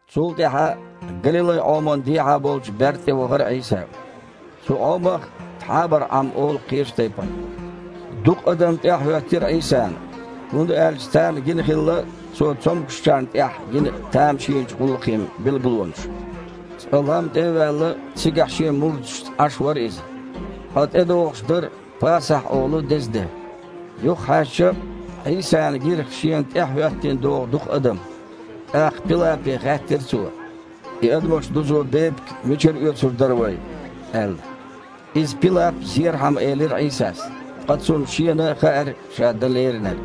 Цул тІаьхьа Галилай-Іоман дехьа болчу берда тІе вахара Іийса. Цу Іомах Тхьабара-Іам олу кхечу тайпана. Дукха адам тІаьхьахІоьттира Іийсана, хІунда аьлча царна гина хилла Цо цомгушчарна тІехь йина тамашийначу гІуллакхийн билгалонаш. Цкъа, лам тІе а ваьлла, цигахь Шен мурдашца Іаш вара Иза. Ткъа тІедогІуш дара « Пасахь» олу деза де. Юхахьаьжча, Іийсана гира Шена тІаьхьахІоьттина догІу дукха адам. ТІаккха Пилапе хаьттира Цо: «И адамаш дузо бепиг мичара оьцур дара вай?» – аьлла. Иза Пилап зерхьама элира Іийсас, ткъа Цунна Шена хаьара Ша дан леринарг.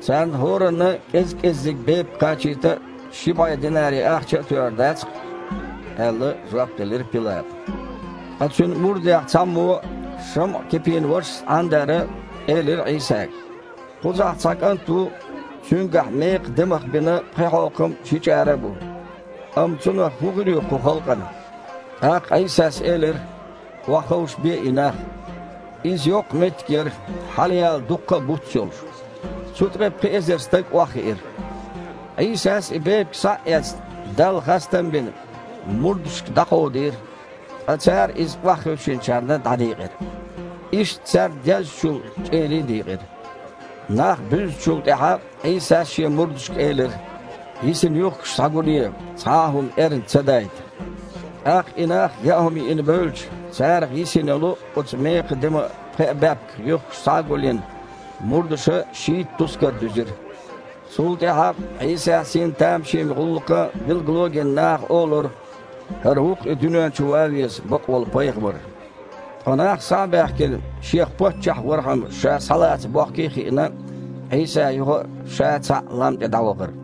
«Царна хІоранна кІез-кІеззиг бепиг кхачийта а, ши бІе динари ахча а тоьур дац-кх», – аьлла, жоп делира Пилапа. Ткъа Цуьнан мурдех цхьаммо, ШамІа-Кипин вашас Іандара, элира Іийсага: «Кхузахь цхьа кІант ву, цуьнгахь мекхан демах бина пхи хьокхам а, ши чІара а бу. Амма цунах хІун хир ю кху халкъана?» ТІаккха Іийсас элира: «Охьаховшабе и нах». Иза йоккха меттиг яра, хьалаяьлла дуккха а буц а йолуш. Цу тІе пхи эзар стаг охьахиира. Іийсас, и бепиг схьа а эцна, Далла хастам а бина, мурдашка дІакховдийра, ткъа цара иза охьахевшинчарна дІадийкъира. Иштта царна деззачул чІерий а дийкъира. Нах буьзначул тІаьхьа, Іийсас Шен мурдашка элира: «Йисина юьхкаш схьагулъе, цхьа а хІума эрна ца дайта». ТІаккха и нах яа хІума йиъна бевлча, царах йисина йолу оцу мекхан деман пхеа баьпкан юьхкаш схьа а гулйина, мурдаша шийтта тускар дуьзира. Цул тІаьхьа, Іийсас йина тамашийна гІуллакхан билгало а гина, наха олура: «ХІара ву-кх и дуьнен чу ван веза бакъволу Пайхамар». Ткъа нах, схьа а баьхкина, Шех паччахь вархьама Ша схьалаца бохкий а хиъна, Іийса юха а Ша цхьаъ лам тІе дІавахара.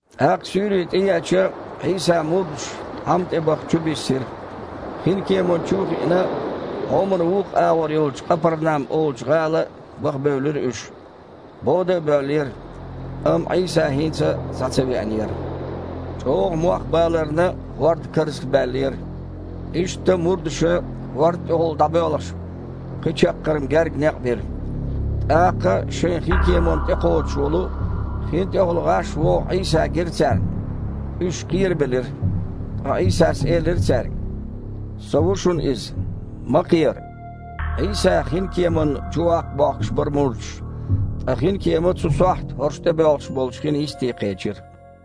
ТІаккха суьйре тІееача, Іийсан мурдаш Іам тІе баха чубиссира. Хинкеман чу а хиъна, Іоман вукху агІор йолчу Къапарнам олучу гІала баха бевлира уьш. Бода а боьллера, амма Іийса хІинца а схьа ца веанера. ЧІогІа мох баларна, хІорд карзахбаьллера. Иштта мурдаша, хІорда тІехула дІабоьлхуш, пхи чаккхарма гергга некъ бира. ТІаккха, шайн хинкеманна тІекхоччуш волу, хин тІехула гІаш вогІу Іийса гира царна. Уьш кхерабелира. Ткъа Іийсас элира цаьрга: «Со ву шуна иза! Ма кхера!» Іийса хинкеманна чуваккха бохкуш бара мурдаш, ткъа хинкема цу сохьта хІорш тІебоьлхуш болчу хин йисте кхечира.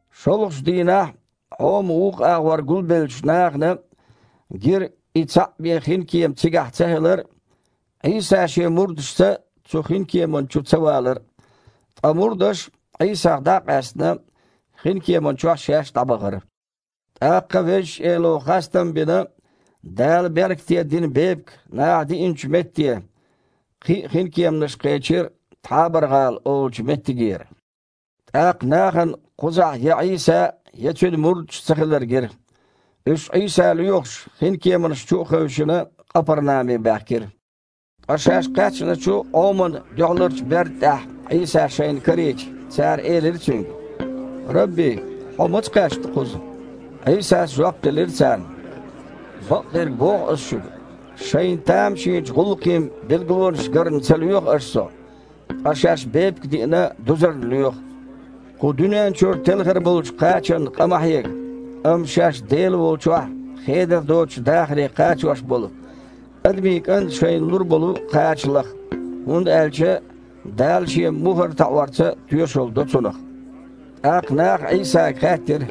ШолгІачу дийнахь Іоман вукху агІор гулбеллачу нахана гира и цхьаъ бен хинкема цигахь ца хилар а, Іийса Шен мурдашца цу хинкеман чу ца валар а. Ткъа мурдаш, Іийсах дІа а къаьстина, хинкеман чохь шаьш дІабахара. ТІаккха Везачу Эло хастам бина, Дала беркате дина бепиг наха диинчу метте, кхин а хинкеманаш кхечира Тхьабара-гІала олучу меттигера. ТІаккха нахана кхузахь я Іийса а, я Цуьнан мурдаш а цахилар гира. Уьш, Іийса лоьхуш, хинкеманаш чу а хевшина, Къапарнаме баьхкира. Ткъа шаьш кхаьчначу Іоман дуьхьаларчу берда тІехь Іийса шайна карийча, цара элира Цуьнга: « Рабби! Хьо маца кхаьчна кхуза?» Іийсас жоп делира царна: «Бакъдерг боху Ас шуьга: Шайна тамашийначу гІуллакхийн билгалонаш гарна ца лоьху аша Со, ткъа шаьш бепиг а диъна дузарна лоьху. Кху дуьнен чуьра телхар болчу кхачанна къа ма хьега. Амма шаьш Дела волчохь хедар доцучу дахаре кхачош болу, Адамийн КІанта шайна лур болу кхача лаха, хІунда аьлча Дала Шен мухІар таІорца тоьшалла до Цунах». ТІаккха наха Іийсага хаьттира: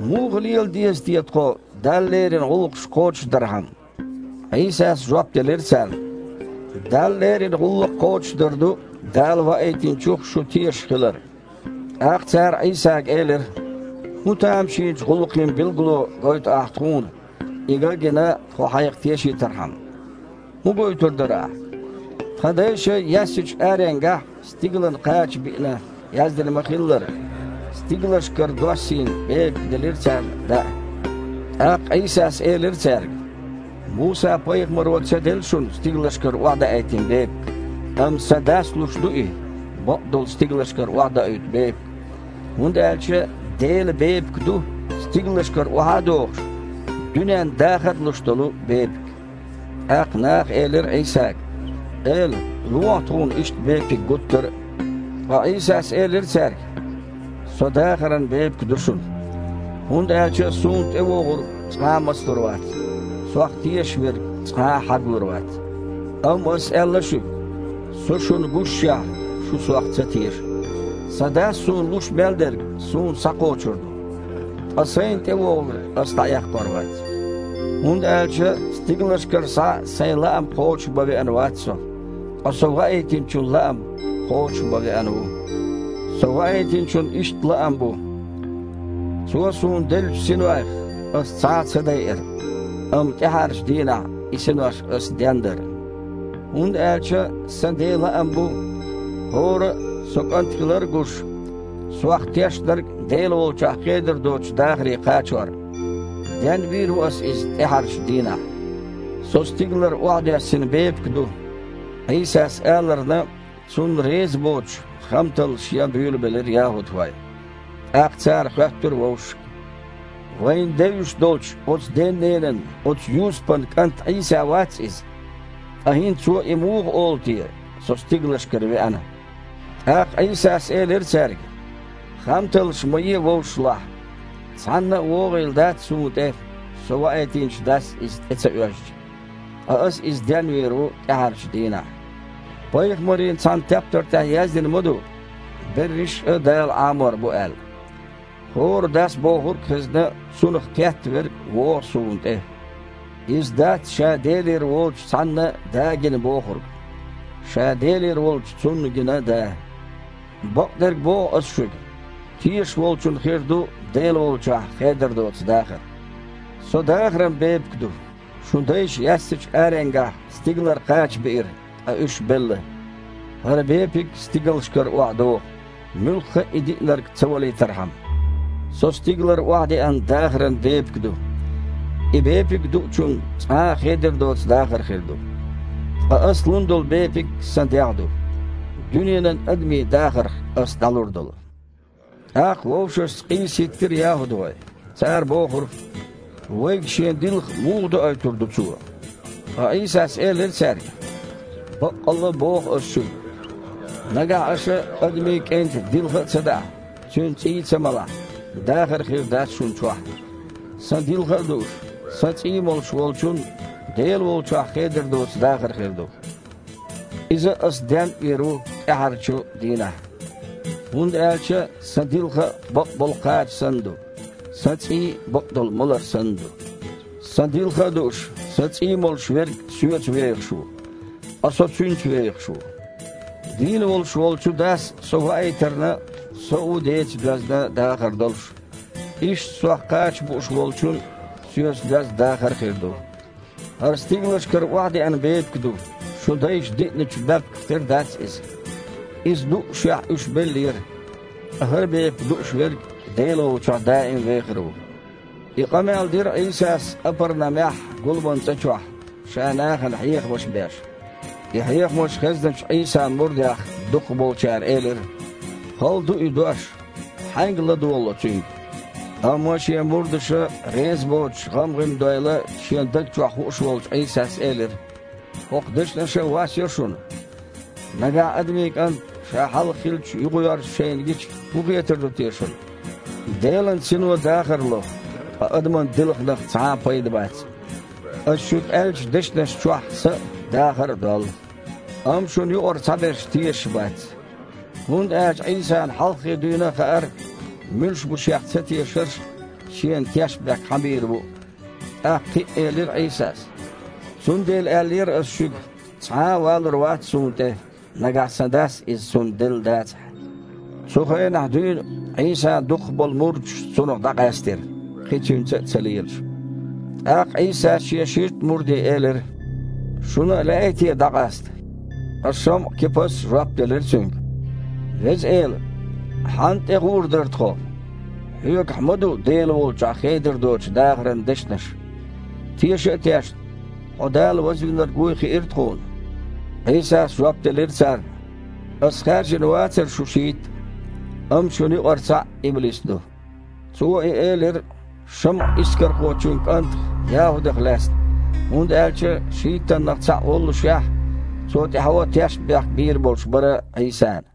«Муха лела деза те тхо, Далла лерина гІуллакхаш кхочушдархьама?» Іийсас жоп делира царна: «Далла лерина гІуллакх кхочушдар ду Дала Ваийтинчух шу тешаш хилар». ТІаккха цара Іийсага элира: «ХІун тамашийначу гІуллакхийн билгало гойту Ахь тхуна, и ган а гина, тхо Хьайх тешийтархьама? ХІун гойтур дара Ахь? Тхан дайша яьссачу аренгахь стигалан кхача биъна, яздина ма-хиллара: „Стигалшкара доссийна бепиг делира царна даа“». ТІаккха Іийсас элира цаьрга: «Муса-пайхамаро ца делла шуна стигалшкара охьадаийтина бепиг, амма Сан Дас луш ду и бакъдолу стигалшкара охьадоуьйту бепиг. ХІунда аьлча Делан бепиг ду, стигалшкара охьа а догІуш, дуьненна дахар а луш долу бепиг». ТІаккха наха элира Іийсага: «Эла, лохьа тхуна иштта бепиг гуттар а!» Ткъа Іийсас элира цаьрга: «Со дахаран бепиг ду шуна. ХІунда аьлча Суна тІевогІург цкъа а мацлур вац, Сох тешаш верг цкъа а хьаглур вац. Амма Ас аьлла шуьга: Со шуна гушшехь, шу Сох ца теша. Сан Дас Суна луш мел дерг Суна схьакхочур ду, ткъа Сайна тІевогІург Ас дІаэккхор вац. ХІунда аьлча стигалшкара схьа Сайн лаам кхочушбан веана вац Со, ткъа Со Ваийтинчун лаам кхочуш бан веана ву. Со Ваийтинчун иштта лаам бу: Цо Суна деллачу синойх Ас цхьа а ца дайар, амма тІаьхьарчу дийнахь и синош Ас дендар. ХІунда аьлча Сан Ден лаам бу, хІора а, Со КІант хилар а гуш, Сох тешнарг Дела волчохь хедар доцучу дахаре кхачор. Денвийр а ву Ас иза тІаьхьарчу дийнахь». «Со стигалара охьадоьссина бепиг ду», – Іийсас аларна, Цунна реза боцуш, хамталлаш ян буьйлабелира яхІудхой. ТІаккха цара хоьттура вовшашка: «Вайна девзаш долчу оцу ден-ненан, оцу Юсупан кІант Іийса вац Иза? Ткъа хІинца Цо и муха олу те: „Со стигалшкара веана“?» ТІаккха Іийсас элира цаьрга: «Хамталлаш ма е вовшашлахь. Цхьаннан а вогІийла дац Суна тІе, Со ваийтинчу Дас иза тІе ца оьзча. Ткъа Аса иза денвийр ву тІаьхьарчу дийнахь. Пайхамарийн цхьана тептар тІехь яздина ма-ду: „Берриш а Дала Іамор бу“, – аьлла. ХІора, Дас бохург а хезна, цунах кхетта верг вогІу Суна тІе. Иза дац ша Делера воцучу цхьанна Да гина бохург. Ша Делера волчу Цунна гина Да. Бакъдерг боху Ас шуьга: Тешаш волчун хир ду Дела волчохь хедар доцу дахар. Со дахаран бепиг ду. Шун дайша яьссачу аренгахь стигалара кхача биира, ткъа уьш белла. ХІара бепиг стигалшкара охьадогІу, муьлхха а и диънарг ца валийтархьама. Со стигалара охьадеана дахаран бепиг ду. И бепиг дуучун цкъа а хедар доцу дахар хир ду. Ткъа Ас лун долу бепиг Сан дегІ ду, дуьненан адамийн дахарх Ас дІалур долу». ТІаккха вовшашца къийса хІиттира яхІудхой. Цара бохура: «Вайга Шен дилха муха доуьйтур ду Цо?» Ткъа Іийсас элира цаьрга: «Баккъалла а боху Ас шуьга: Нагахь аша Адамийн КІентан дилха а ца даахь, Цуьнан цІий а ца малахь, дахар хир дац шуна чохь. Сан дилха а дууш, Сан цІий а молуш волчун Дела волчохь хедар доцу дахар хир ду. Иза Ас денвийр а ву тІаьххьарчу дийнахь. ХІунда аьлча Сан дилха а бакъболу кхача санна ду, Сан цІий а бакъдолу малар санна ду. Сан дилха а дууш, Сан цІий а молуш верг Соьца вехаш ву, ткъа Со цуьнца вехаш ву. Дийна волуш волчу Дас Со ваийтарна, Со а ву Деца доьзна дахар долуш. Иштта Сох кхача бууш волчун а Соьца доьзна дахар хир ду. ХІара стигалшкара охьадеана бепиг ду. Шун дайша диъначу баьпках тера дац иза. Иза дуъушехь, уьш беллера. Ткъа хІара бепиг дууш верг Дела волчохь даим а вехар ву». И къамел дира Іийсас Къапарнамехь гуламан цІа чохь, Ша нахана хьехамаш беш. И хьехамаш хезначу Іийсан мурдех дукхахболчара элира: «Хала ду и дош. Хьаьнга ладогІало цуьнга?» Амма Шен мурдаша реза боцуш гІам-гІим дойла Шен даг чохь хууш волчу Іийсас элира: «ХІокху дешнаша а вас йо шуна? Нагахь Адамийн КІант Ша хьалха хиллачу юхавоьрзуш шайна гича, хІун хетар ду те шуна? Делан Сино дахар ло, ткъа адаман дилханах цхьа а пайда бац. Ас шуьга аьллачу дешнашна чохь са а, дахар а доллу. Амма шуна юкъара цхьаберш тешаш бац». ХІунда аьлча Іийсана хьалххе дуьйна а хаьара муьлш бу Шех цатешарш а, Шена тешнабехк хьан бийр бу а. ТІаккха кхин а элира Іийсас: «Цундела аьллера Ас шуьга, цхьа а валур вац Суна тІе, нагахь санна Сан Дас иза цунна делла дацахь». Цу хенахь дуьйна Іийсан дукхах болу мурдаш Цунах дІакъаьстира, кхин Цуьнца а ца лелаш. ТІаккха Іийсас Шен шийтта мурде элира: «Шуна а лаьий те дІакъаста?» Ткъа ШамІа-Кипас жоп делира Цуьнга: «Веза Эла, хьанна тІегІур дара тхо? Хьоьгахь ма-ду Дела волчохь хедар доцучу дахаран дешнаш. Теша а тешна, Хьо Дала Вазвинарг вуй хиира тхуна». Іийсас жоп делира царна: «Ас хаьржина вацара шу шийтта? Амма шуна юкъара цхьаъ иблис ду». Цо и элира ШамІа-Искархочун кІантах ЯхІудах лаьцна. ХІунда аьлча шийттаннах цхьаъ воллушехь, цо тІаьхьо тешнабехк бийр болуш бара Іийсана.